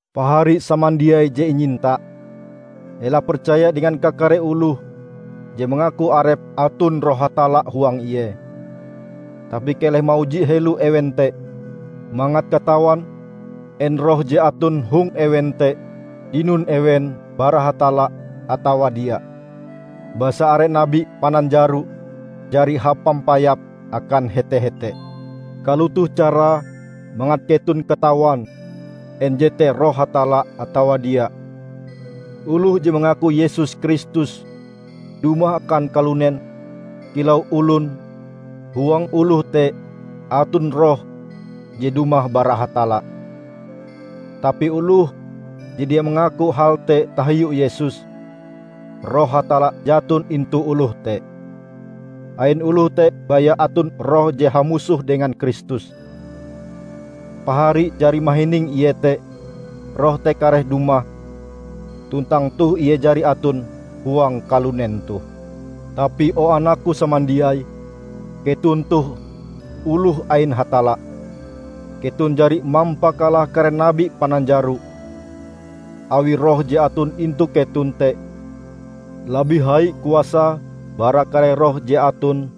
Pahari samandiai je inyinta! Ela percaya dengan kakare oloh je mangaku arepe aton Roh Hatalla huang ie, tapi keleh mauji helo ewen te mangat katawan en roh je aton hong ewen te dinon ewen bara Hatalla atawa dia. Basa are nabi pananjaro jari hapampayap akan hete-hete. Kalotoh carae mangat keton katawan en jete Roh Hatalla atawa dia: Oloh je mangaku Yesus Kristus dumah akan kalunen kilau olon huang oloh te aton Roh je dumah bara Hatalla. Tapi oloh je dia mangaku hal te tahiu Yesus, Roh Hatalla jaton intu oloh te. Ain oloh te baya aton roh je hamusoh dengan Kristus. Pahari jari mahining iete, roh te kareh dumah, tuntang toh ie jari aton huang kalunen toh. Tapi o anakku samandiai, keton toh oloh ain Hatalla. Keton jari mampakalah kare nabi pananjaro, awi Roh je aton intu keton te labih hai kuasae bara kare roh je aton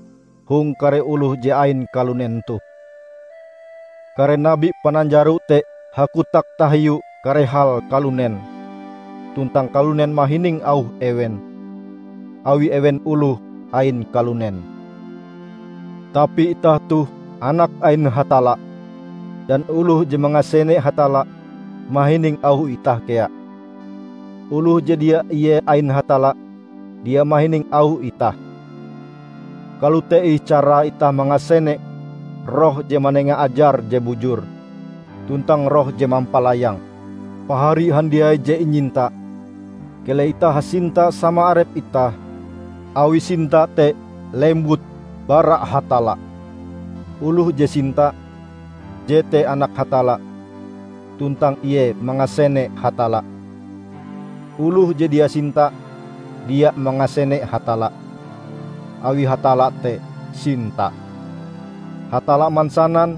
hong kare oloh je ain kalunen toh. Kare nabi pananjaro te hakotak tahiu kare hal kalunen, tuntang kalunen mahining auh ewen, awi ewen oloh ain kalunen. Tapi itah toh anak ain Hatalla; dan oloh je mangasene Hatalla, mahining auh itah kea. Oloh je dia ie ain Hatalla, dia mahining auh itah. Kalote ih carae itah mangasene Roh je manenga ajar je bujur, tuntang roh je mampalayang. Pahari handiai je inyinta! Keleh itah hasinta sama arep itah, awi sinta te lembut bara Hatalla. Oloh je sinta, jete anak Hatalla tuntang ie mangasene Hatalla. Oloh je dia sinta, dia mangasene Hatalla; awi Hatalla te sinta. Hatalla mansanan,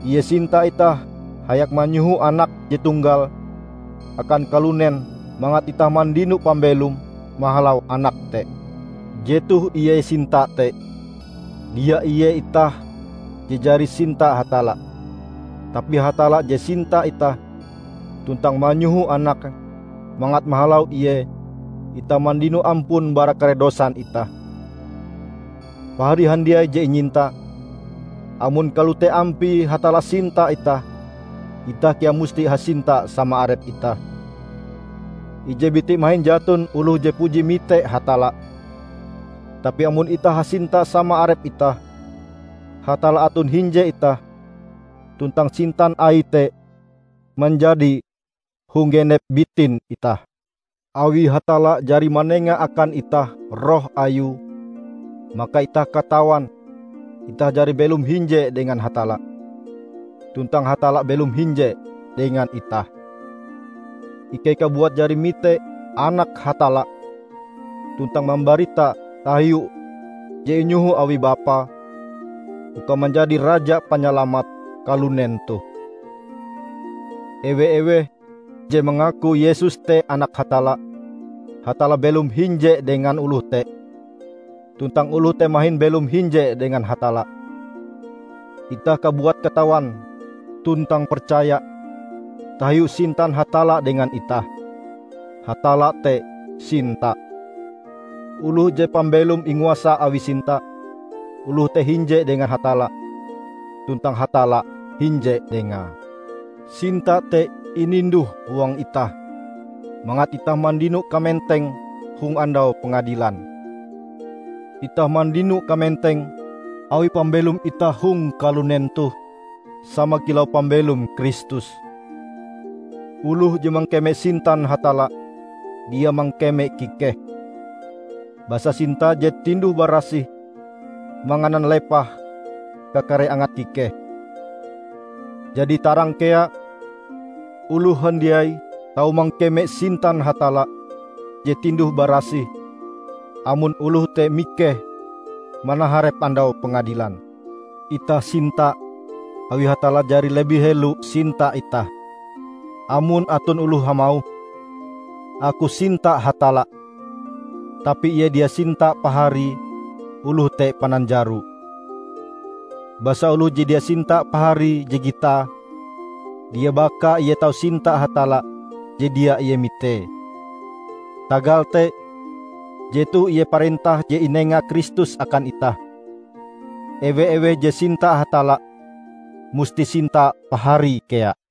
Ie sinta itah hayak manyoho Anake je tonggal akan kalunen mangat itah mandino pambelom mahalau Anake te. Jetoh ie sinta te: Dia ie itah je jari sinta Hatalla, tapi Hatalla je sinta itah tuntang manyoho Anake mangat mahalau Ie itah mandino ampun bara kare dosan itah. Pahari handiai je inyinta, amon kalote ampie Hatalla sinta itah, itah kea musti hasinta sama arep itah. Ije biti mahin jaton oloh je puji mite Hatalla, tapi amon itah hasinta sama arep itah, Hatalla aton hinje itah tuntang sintan Aie te manjadi hong genep bitin itah. Awi Hatalla jari manenga akan itah Roh Ayue, maka itah katawan itah jari belom hinje dengan Hatalla, tuntang Hatalla belom hinje dengan itah. Ikei kabuat jari mite Anak Hatalla, tuntang mambarita tahiu je inyoho awi Bapa uka manjadi Raja Panyalamat kalunen toh. Ewe-eweh je mangaku Yesus te Anak Hatalla, Hatalla belom hinje dengan oloh te tuntang oloh te mahin belom hinje dengan Hatalla. Itah kabuat katawan tuntang percaya tahiu sintan Hatalla dengan itah. Hatalla te sinta. Oloh je pambelome inguasa awi sinta, oloh te hinje dengan Hatalla, tuntang Hatalla hinje dengae. Sinta te ininduh huang itah, mangat itah mandino kamenteng hong Andau Pengadilan. Itah mandino kamenteng awi pambelom itah hong kalunen toh sama kilau pambelom Kristus. Oloh je mangkeme sintan Hatalla, dia mangkeme kikeh; basa sinta je tinduh-barasih manganan lepah kakare angat kikeh. Jadi tarang kea, oloh handiai tau mangkeme sintan Hatalla je tinduh-barasih amon oloh te mikeh manaharep Andau Pengadilan. Itah sinta, awi Hatalla jari labih helo sinta itah. Amon aton oloh hamauh, "Aku sinta Hatalla," tapi ie dia sinta paharie, oloh te pananjaro. Basa oloh je dia sinta paharie je gitae, dia bakae ie tau sinta Hatalla je dia ie mitee. Tagal te, jetoh ie parentah je inenga Kristus akan itah: ewe-eweh je sinta Hatalla, musti sinta paharie kea.